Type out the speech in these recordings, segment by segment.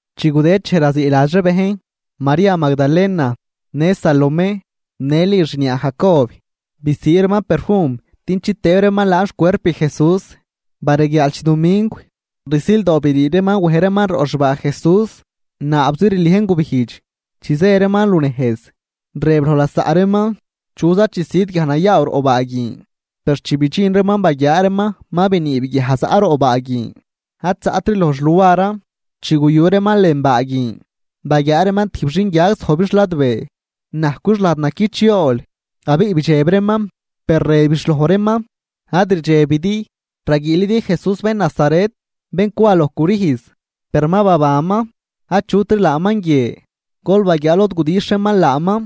Chi gudëd dxej raziiladx ree bejn, María Magdalena, në Salomé, në Li xniaa Jacob, bisii reeman perfum din chitëëb reeman laan xcuerp Jesús. Bareguiaal chidumingw, rsildoo brii reeman wej reeman roꞌ xbaa Jesús, naabzi rliejn gubijdx. Chi zë reeman lunejz, rëb loj lasaꞌ reeman: ―¿Chuza chisüd guiaj nayaaw roꞌ baa guin? Per chi bidxin reeman baguiaa reeman ma biniib guiaj zaꞌ roꞌ baa guin ad zaꞌtri loj xluaran. Chi guyu reeman lën baa guin, baguiaa reeman tijb xinguiag zojbix ladbee, najcwix lajd naquich yool, abiꞌ bidxeb reeman. Per rëbix loj reeman: ―Ad rdxebidi, raguiilidi Jesús bén Nazaret bén cwa loj crüjz. Per ma babanman, achutri laaman guie, gol baguiaa lod gudixh reeman laaman.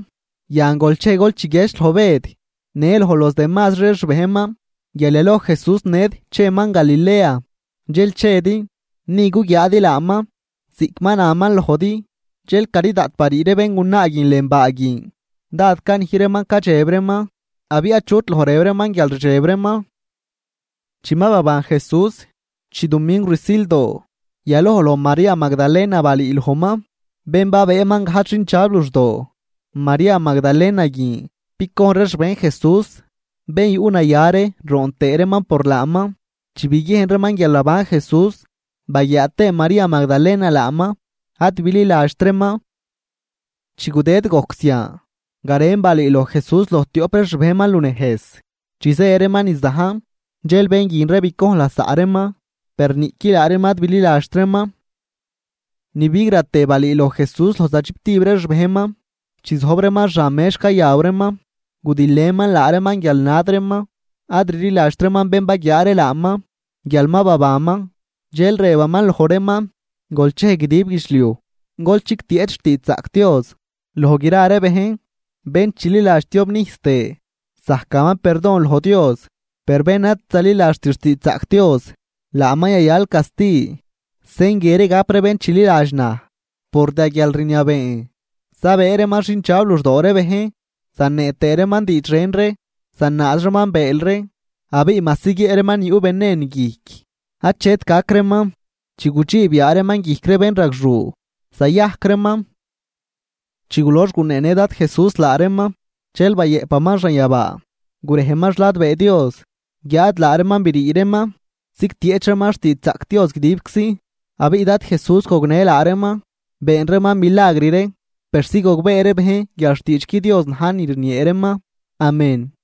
Yan, gol chej gol chiguiedx loj Bëd në loj los demazri ree xbejnman guial yaloj Jesús ned cheman Galilea dxel chedi, ni guguiaadi laaman ziꞌc ma naman lojdi. Dxel cari daꞌt barii ree béngunaa guin lën baa guin, dád canij reeman cadxeb reeman, abiꞌ achut loj rëb reeman guial rdxeb reeman. Chi ma baban Jesús, chidumingw rsildoo, yaloj loj María Magdalena balüülojman, bén babëëman gajdx xindxab luxdoo. María Magdalena guin bicojn ree xbejn Jesús, bén yuꞌnaya ree roon tëë reeman por laaman. Chi biguiejn reeman guial naban Jesús baguiaa tëë María Magdalena laaman, ad bililadxt reeman. Chi gudëd gojc zian, garen balüüloj Jesús loj tioꞌp ree xbejnman lunejz chi zë reeman niz dajn. Dxel bén guin ree bicojn lasaꞌ reeman, per niꞌqui laa reeman ad bililadxt reeman. Ni bigratë balüüloj Jesús loj za chiptib ree xbejnman, chi zojb reeman xan mex cayaw reeman, gudilëman laa reeman guial nad reeman, ad rliladxt reeman bén baguiaa ree laaman guial ma babanman. Dxel rëbaman loj reeman: ―Gol chej guidib guidxliuj, gol chigtieꞌch xtiidxzaꞌc Dios loj gra ree bejn. Bén chililadx tiobnijs tëë zajcaman perdon loj Dios. Per bén ad zaliladxt xtiidxzaꞌc Dios, laaman yayal casti. Sen guie ree gap ree bén chililadx naj: Por da guialrniabeen zabëë reeman xindxab luxdoo ree bejn, zanee tëë reeman diidx ren ree, zanaaz reeman bëël ree, abiꞌ majsi guiëꞌ reeman ni yuꞌ venen guijc achet gac reeman, chi gudxiib yaa reeman guijc ree bénragxuu, zayajc reeman. Chi gulox guneenë Dad Jesús laa reeman, dxel bayëꞌpaman xanyabaa, gurejman xladbee Dios. Guiáad laa reeman brii reeman zigtieꞌch reeman xtiidxzaꞌc Dios guidibczi. Abiꞌ Dad Jesús gognë laa reeman, been reeman milagr ree, persi gogbee ree bejn guial xtiidxqui Dios na̱j ni rniee reeman. Amén.